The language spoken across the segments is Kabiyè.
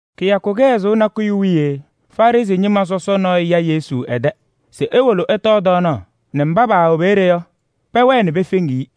Kɩyakʋ kɩhɛzʋʋ nakʋyʋ wiye Farɩsɩ ñɩma sɔsɔ nɔɔyʋ ya Yesu ɛ-tɛ se ewolo ɛtɔɔ tɔɔnaɣ nɛ mba paawɛ peeye yɔ, pɛwɛɛ pefeŋiɣ-i.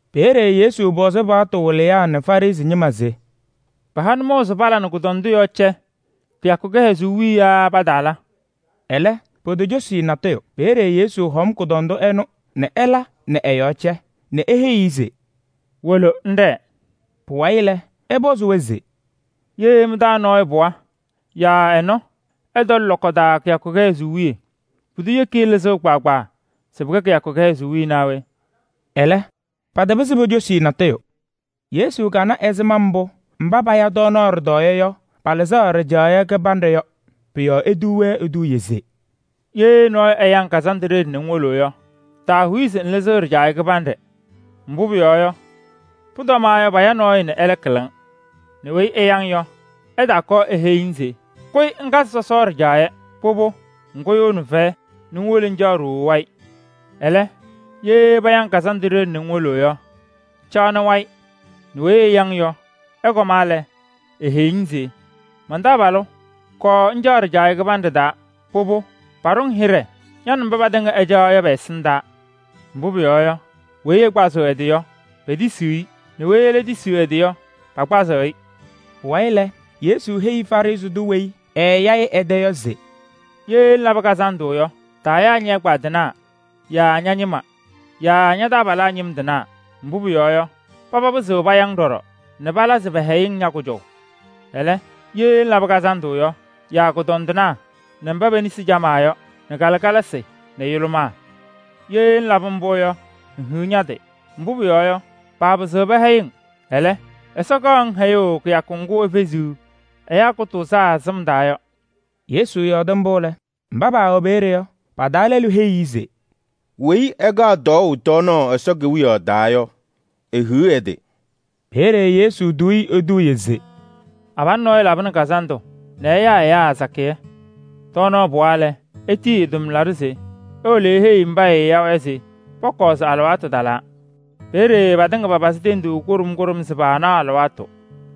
Peeye Yesu pɔzɩ paɣtʋ wɩlɩyaa nɛ Farɩsɩ ñɩma se: “Pɩha nʋmɔʋ se pala nɛ kʋdɔndʋ nɔɔyʋ yɔɔ cɛ kɩyakʋ kɩhɛzʋʋ wiye yaa pataala?” Ɛlɛ potocosi-i natʋyʋ. Peeye Yesu hɔm kʋdɔndʋ ɛnʋ nɛ ɛla nɛ ɛ-yɔɔ cɛ nɛ eheyi-i se: “Wolo ŋɖɛɛ.” Pʋwayɩ lɛ, ɛpɔzɩ-wɛ se: “Ye mɩ-taa nɔɔyʋ pɩɣa yaa ɛ-nɔ ɛtɔlɩ lɔkɔ taa kɩyakʋ kɩhɛzʋʋ wiye, pʋdʋ yeki-i lɩzʋʋ kpaagbaa se pɩkɛ kɩyakʋ kɩhɛzʋʋ naa we?” Ɛlɛ patapɩzɩ pocosi-i natʋyʋ. Yesu kana ɛzɩma mbʋ mba paya tɔɔnaɣ ɖɩtɔɔyɛ yɔ, palɩzɩɣ ɖɩjaɣyɛ kɩbanɖɛ yɔ. Pʋ-yɔɔ etuu-wɛ eduuye se: “Ye nɔɔyʋ ɛya-ŋ kazandʋ ɖeɖe nɛ ŋwolo yɔ, taahuyi se ŋlɩzɩɣ ɖɩjaɣyɛ kɩbanɖɛ. Mbʋ pʋyɔɔ yɔ, pʋtɔmaɣ yɔ paya nɔɔyʋ nɛ ɛlɛ kɩlɩ-ŋ nɛ weyi ɛya-mɩ yɔ, ɛtaakɔɔ eheyi-ŋ se: ‘Kʋyɩ ŋkazɩ sɔsɔ ɖɩjaɣyɛ.’ Pʋbʋ, ŋkʋyʋʋnɩ fɛyɛ nɛ ŋwolo ŋcaɣnɩ ɖooo wayɩ. Ɛlɛ, ye paya-ŋ kazandʋ ɖeɖe nɛ ŋwolo yɔ, caɣnɩ wayɩ nɛ weyi ɛya-ŋ yɔ, ɛkɔma lɛ, eeheyi-ŋ se: ‘Man-taabalʋ! Kɔɔ ŋcaɣ ɖɩjaɣyɛ kɩbanɖɛ taa.’ Pʋbʋ, paɖʋ-ŋ hɩɖɛ ña nɛ mba patɩŋa ɩcaɣaɣ yɔ pɛ-ɛsɩndaa. Mbʋ pʋyɔɔ yɔ, weyi ɛkpazɩɣ ɛ-tɩ yɔ, petisiɣ-i nɛ weyi ɛlɛ tisiɣ ɛ-tɩ yɔ, pakpazɩ-ɩ.” Pʋwayɩ lɛ, Yesu heyi Farɩsɩ tʋ weyi ɛɛya-ɩ ɛ-tɛ yɔ se: “Ye ŋlabɩ kazandʋ yɔ, taayaa ñɛ-ɛgbaadɩnaa yaa ña-ñɩma yaa ña-taabalaa ñɩm tɩnaa. Mbʋ pʋyɔɔ yɔ, papɩzɩɣ paya-ŋ ɖɔɖɔ nɛ pɩla se pɛhɛyɩ-ŋ ña-kʋjɔʋ. Ɛlɛ, ye ŋlabɩ kazandʋ yɔ, yaa kʋñɔndɩnaa nɛ mba pe-nesi camaa yɔ nɛ kalɩkalasɩ nɛ yʋlʋmaa. Ye ŋlabɩ mbʋ yɔ, ŋhiɣ ña-tɩ! Mbʋ pʋyɔɔ yɔ, paapɩzɩɣ pɛhɛyɩ-ŋ. Ɛlɛ, Ɛsɔ kaɣnɩ-ŋ hɛyʋʋ kɩyakʋ ŋgʋ efeziɣ ɛyaa kʋtʋʋzaa sɩm taa yɔ.” Yesu yɔɔdɩ mbʋ lɛ, mba paawɛ peeye yɔ, pa-taa lɛlʋ heyi-i se: “Weyi ɛkaɣ tɔɔʋ tɔɔnaɣ Ɛsɔ Kewiyaɣ taa yɔ, ehiɣ ɛ-tɩ!” Peeye Yesu tuu-i eduuye se: “Abalʋ nɔɔyʋ labɩnɩ kazandʋ nɛ ɛyaa ɛyaa sakɩyɛ. Tɔɔnaɣ pɩwa lɛ, etiyi ɛ-tʋmlaɖʋ se ewolo eheyi mba ɛɛya-wɛ yɔ se pɔkɔɔ se alɩwaatʋ talaa. Peeye patɩŋa papazɩ tenduu kʋɖʋm kʋɖʋm se paanaɣ alɩwaatʋ.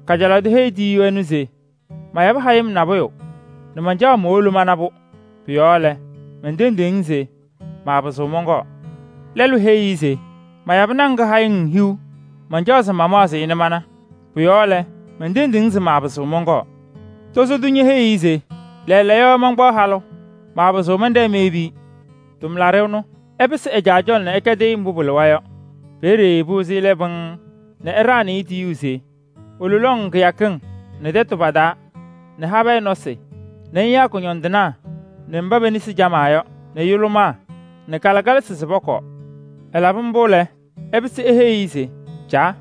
Kajalaɣ tʋ heyi tiyiyu ɛnʋ se: ‘Mayabɩ hayɩm nabʋyʋ nɛ mancaɣ se mowolo mana-pʋ. Pʋ-yɔɔ lɛ, mentendiɣ-ŋ se maapɩzɩɣ mɔnkɔɔ.’ Lɛlʋ heyi-i se: ‘Mayabɩ naŋ kɩhayɩŋ hiu, mancaɣ se mamaɣzɩ-ɩ nɛ mana. Pʋ-yɔɔ lɛ, mentendiɣ-ŋ se maapɩzɩɣ mɔnkɔɔ.’ Tozo tʋ ñeheyi-i ɖɔɖɔ se: ‘Lɛɛlɛɛyɔ mankpaɣ halʋ, maapɩzɩɣ mɛnɖɛɛ meyebi-i.’ Tʋmlaɖʋ ɛnʋ, ɛpɩsɩ ɛ-caa cɔlɔ nɛ ɛkɛdɩ-ɩ mbʋ pɩlɩwa yɔ. Peeye pɩwɩzɩ ɛlɛ pɩŋŋ nɛ ɛɖaɣnɩ-ɩ tiyuu se: ‘Wolo lɔŋ kɩyakɩŋ nɛ tɛtʋ pa-taa nɛ habɛɛ nɔsɩ nɛ ŋyaa kʋñɔndɩnaa nɛ mba pe-nesi camaa yɔ nɛ yʋlʋmaa nɛ kalɩkalasɩ nɛ pɔkɔɔ.’ Ɛlabɩ mbʋ lɛ, ɛpɩsɩ eheyi-i se: ‘Caa!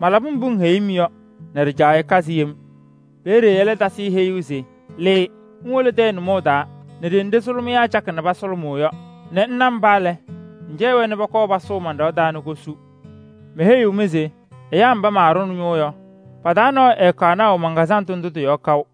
Malabɩ mbʋ ŋheyi-m yɔ nɛ ɖɩjaɣyɛ kazɩ yem.’ Peeye ɛlɛ tasɩ-ɩ heyuu se: ‘Lɩɩ ŋwolo tɛyɛ nʋmɔŋ taa nɛ ɖenɖe sʋlʋmɩyaa cakɩ pasʋlʋmʋʋ yɔ nɛ ŋna mba lɛ, ŋcɛyɩ-wɛ nɛ pɔkɔɔ pasʋʋ man-ɖɩɣa taa nɛ kosu. Meheyiɣ-mɩ se ɛyaa mba maaɖʋnɩ ñʋʋ yɔ, pa-taa nɔɔyʋ ɛɛkaɣ naʋ man-kazandʋ ndʋ tɩ-yɔɔ kaʋ.’”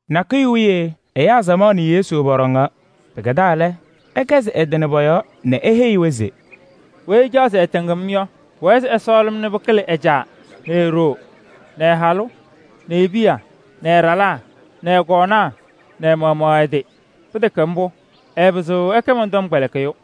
Nakʋyʋ wiye ɛyaa samaɣ nɛ Yesu pɔɖɔŋaɣ. Pɩkɛdaa lɛ, ɛkɛzɩ ɛ-tɩ nɛ pɔ-yɔɔ nɛ eheyi-wɛ se: “Weyi ɛcaɣ se ɛtɩŋ-m yɔ, pʋwɛɛ se ɛsɔɔlɩ-m nɛ pɩkɩlɩ ɛ-caa nɛ e-ɖoo nɛ ɛ-halʋ nɛ e-piya nɛ ɛ-ɖalaa nɛ ɛ-kɔɔnaa nɛ ɛ-maɣmaɣ ɛ-tɩ. Pɩtɛkɛ mbʋ, ɛɛpɩzɩɣ ɛkɛ mɔn-tɔmkpɛlɩkɩyʋ.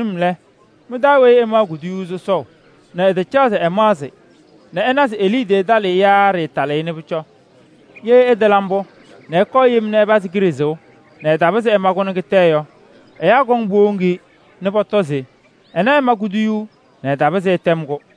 Toovenim lɛ, mɩ-taa weyi ɛmaɣ kuduyuu sɔsɔʋ nɛ ɛtacaɣ se ɛmaɣzɩ nɛ ɛna se e-liidiye talɩɣ-ɩ yaa ɖɩɩtalɩɣ-ɩ nɛ pʋcɔ? Ye ɛtala mbʋ nɛ ɛkʋyɩ yem ɛpazɩ kiɖe sɩʋ nɛ ɛtapɩzɩ ɛma-kʋ nɛ kɩtɛ yɔ, ɛyaa kɔŋ powoŋ-i nɛ pɔtɔ se: ‘Ɛnɛ ɛma kuduyuu nɛ ɛtapɩzɩ ɛtɛm-kʋ.’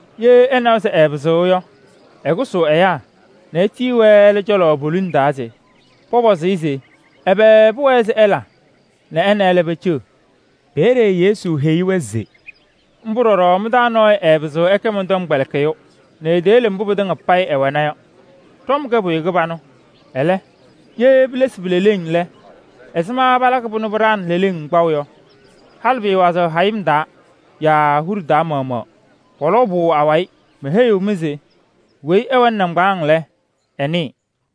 Ye ɛnawa se ɛɛpɩzɩɣ yɔ, ɛkʋsʋʋ ɛyaa nɛ etiyi-wɛ ɛlɛ cɔlɔ poliŋ taa se pɔpɔzɩ-ɩ se ɛbɛ pʋwɛɛ se ɛla nɛ ɛ nɛ ɛlɛ peceɣ.” Peeye Yesu heyi-wɛ se: “Mbʋ ɖɔɖɔ mɩ-taa nɔɔyʋ ɛɛpɩzɩɣ ɛkɛ mɔn-tɔmkpɛlɩkɩyʋ nɛ eteyele mbʋ pɩtɩŋa payɩ ɛwɛna yɔ.” “Ɖɔm kɛ pʋyʋ kɩbanʋ. Ɛlɛ, ye pilesi pi-leleŋ lɛ, ɛzɩma palakɩ-pʋ nɛ pɩɖaɣnɩ leleŋ kpaʋ yɔ? Halɩ pɩɩwazɩɣ hayɩm taa yaa huɖe taa maɣmaɣ. Pɔlɔʋ-pʋ awayɩ. Meheyiɣ-mɩ se weyi ɛwɛnɩ nɩŋgbaaŋ lɛ, ɛnɩɩ.”